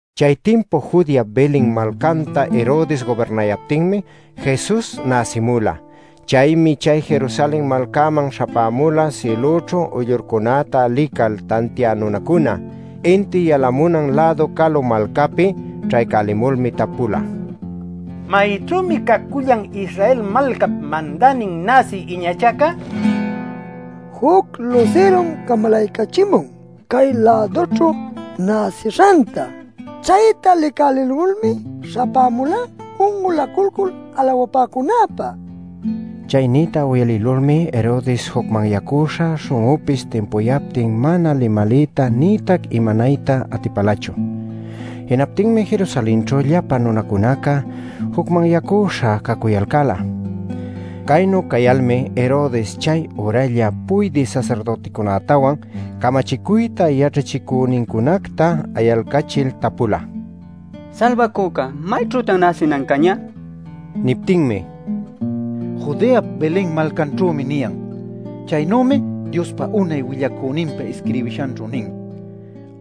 Chay timpu Judeap Belen malcanta Herodes gubirnayaptinmi Jesus näsimula. Chaymi chay Jerusalen malcaman śhapämula sïlućhu uyllurcunäta lical tantiä nunacuna, inti yalamunan-lädu calu malcäpi. Ćhaycälimulmi tapula: “¿Mayćhümi cacullan Israel malcap mandänin näsï iñachaca? Juc lusirum camalaycachimun cay-lädućhu näsishanta. Chayta licälälimulmi śhapämulá un'ulacuycul alawapäcunäpä” nil. Chay nïta uyalïlulmi Herodes jucmanyacüśha śhun'unpis timpucuyaptin mana limaliyta nïtac imanayta atipalachu. Jinaptinmi Jerusalenćhu llapan nunacunaca jucmanyacüśha cacuyalcäla. Caynu cayalmi Herodes chay üralla puydï sasirdüticunätawan camachicuyta yaćhachicünincunacta ayalcachil tapula: “Salbacüca ¿mayćhütan näsinan cañä?” nil. Niptinmi: “ ‘Judeap Belen malcanćhümi’ niyan. Chaynümi Diospa unay willacüninpa isquirbishanćhu nin: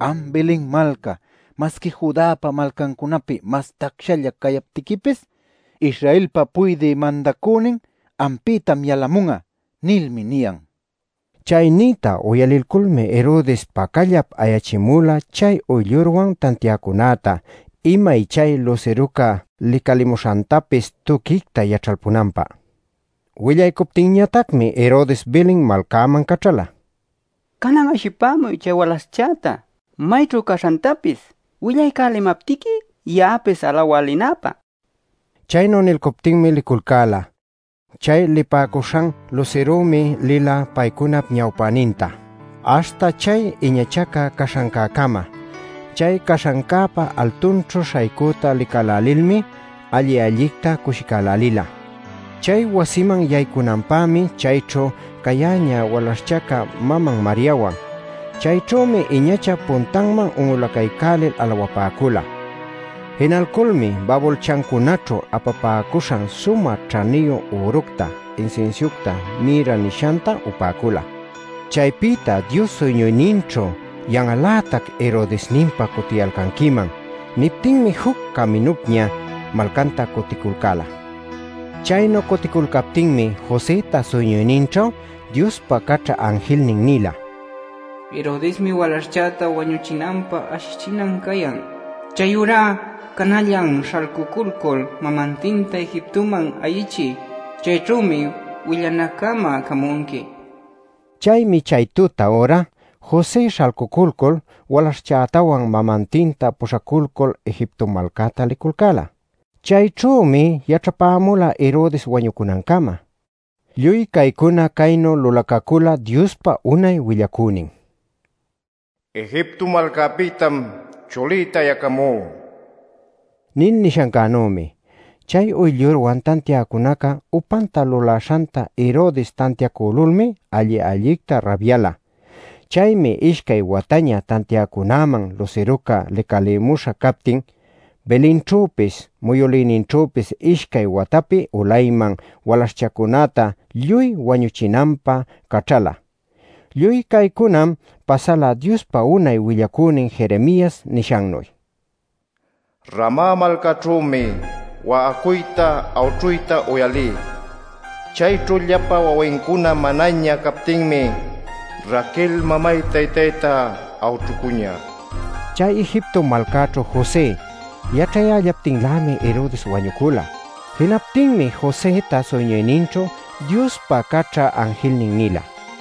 ‘Am Belen malca, masqui Judäpa malcancunapi mas tacsalla cayaptiquipis, Israelpa puydï mandacünin ampïtam yalamun'a’ nilmi niyan” nila. Chay niyta uyalilculmi Herodes pacallap ayachimula chay uyllurwan tantiäcunäta imay chay lusiruca licalimuśhantapis tuquicta yaćhalpunanpä. Willaycuptinñatacmi Herodes Belen malcäman caćhala: “Canan ashipämuy chay walaśhchäta mayćhu caśhantapis, willaycälimaptiqui ya'apis alawä linäpä” nil. Chaynu nilcuptinmi liculcäla. Chay licapäcuśhan lusirümi lila paycunap ñawpäninta aśhta chay iñachaca caśhancäcama. Chay caśhancäpa altunćhu śhaycüta licälälilmi alli-allicta cushicälälila. Chay wasiman yaycunanpämi chayćhu cayäñä walaśhchaca maman Mariawan. Chayćhümi iñachap puntanman un'ulacaycälil alawapäcula. Jinalculmi babulchancunaćhu apapäcuśhan sumä ćhaniyu üructa, insinsiucta mirra nishanta upäcula. Chaypïta Dios suyñuyninćhu “Yan'al-lätac Herodesninpa cutiyalcanquiman” niptinmi juc caminupña malcanta cuticulcäla. Chaynu cuticulcaptinmi Josëta suyñuyninćhu Diospa caćha anjilnin nila: “Herodesmi walaśhchäta wañuchinanpä ashichinan cayan. Chayurá canallan śhalcuculcul mamantinta Egiptoman ayichiy. Chayćhümi willanaccama camunqui” nil. Chaymi chay tuta üra, José śhalcuculcul walaśhchätawan mamantinta puśhaculcul Egipto malcäta liculcäla. Chayćhümi yaćhapäcula Herodes wañunancama. Lluy caycuna caynu lulacacüla Diospa unay willacünin “Egipto malcapïtam chulïta ayacamú” nil nishancänümi. Chay uyllurwan tantiäcunaca upanta lulaśhanta Herodes tantiacülulmi alli-allicta rabyala. Chaymi ishcay wataña tantiäcunäman lusiruca licalïmuśha captin, Belenćhüpis muyülïninćhüpis ishcay watapi ulayman walaśhcunäta lluy wañuchinanpä caćhala. Lluy caycunam pasala Diospa unay willacünin Jeremias nishannuy: “Rama malcaćhümi wa'acuyta, awćhuyta uyalí. Chayćhu llapa wawincuna manaña captinmi Raquel mamay-taytayta awćhucuñä” nil. Chay Egipto malcaćhu José yaćhayällaptinlämi Herodes wañucula. Jinaptinmi Josëta suyñuyninćhu Diospa caćha anjilnin nila: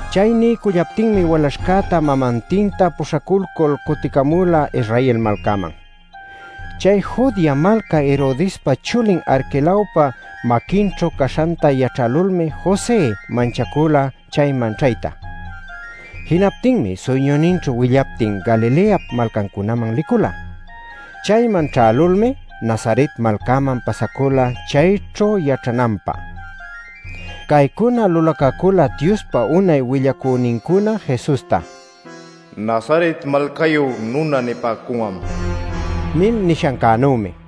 Chay niycullaptinmi walaśhcäta mamantinta puśhaculcul cuticamula Israel malcanman. Chay Judea malca Herodespa chulin Arquelaop maquinćhu caśhanta yaćhälulmi José manchacula chayman ćhayta. Jinaptinmi suyñuyninćhu willaptin Galileap malcancunaman licula. Chayman ćhälulmi Nazaret malcaman pasacula chayćhu yaćhananpä. Caycuna lulacacüla Diospa unay willacünincuna Jesusta “Nazaret malcayu nuna nipäcun'am” nil nishancänümi.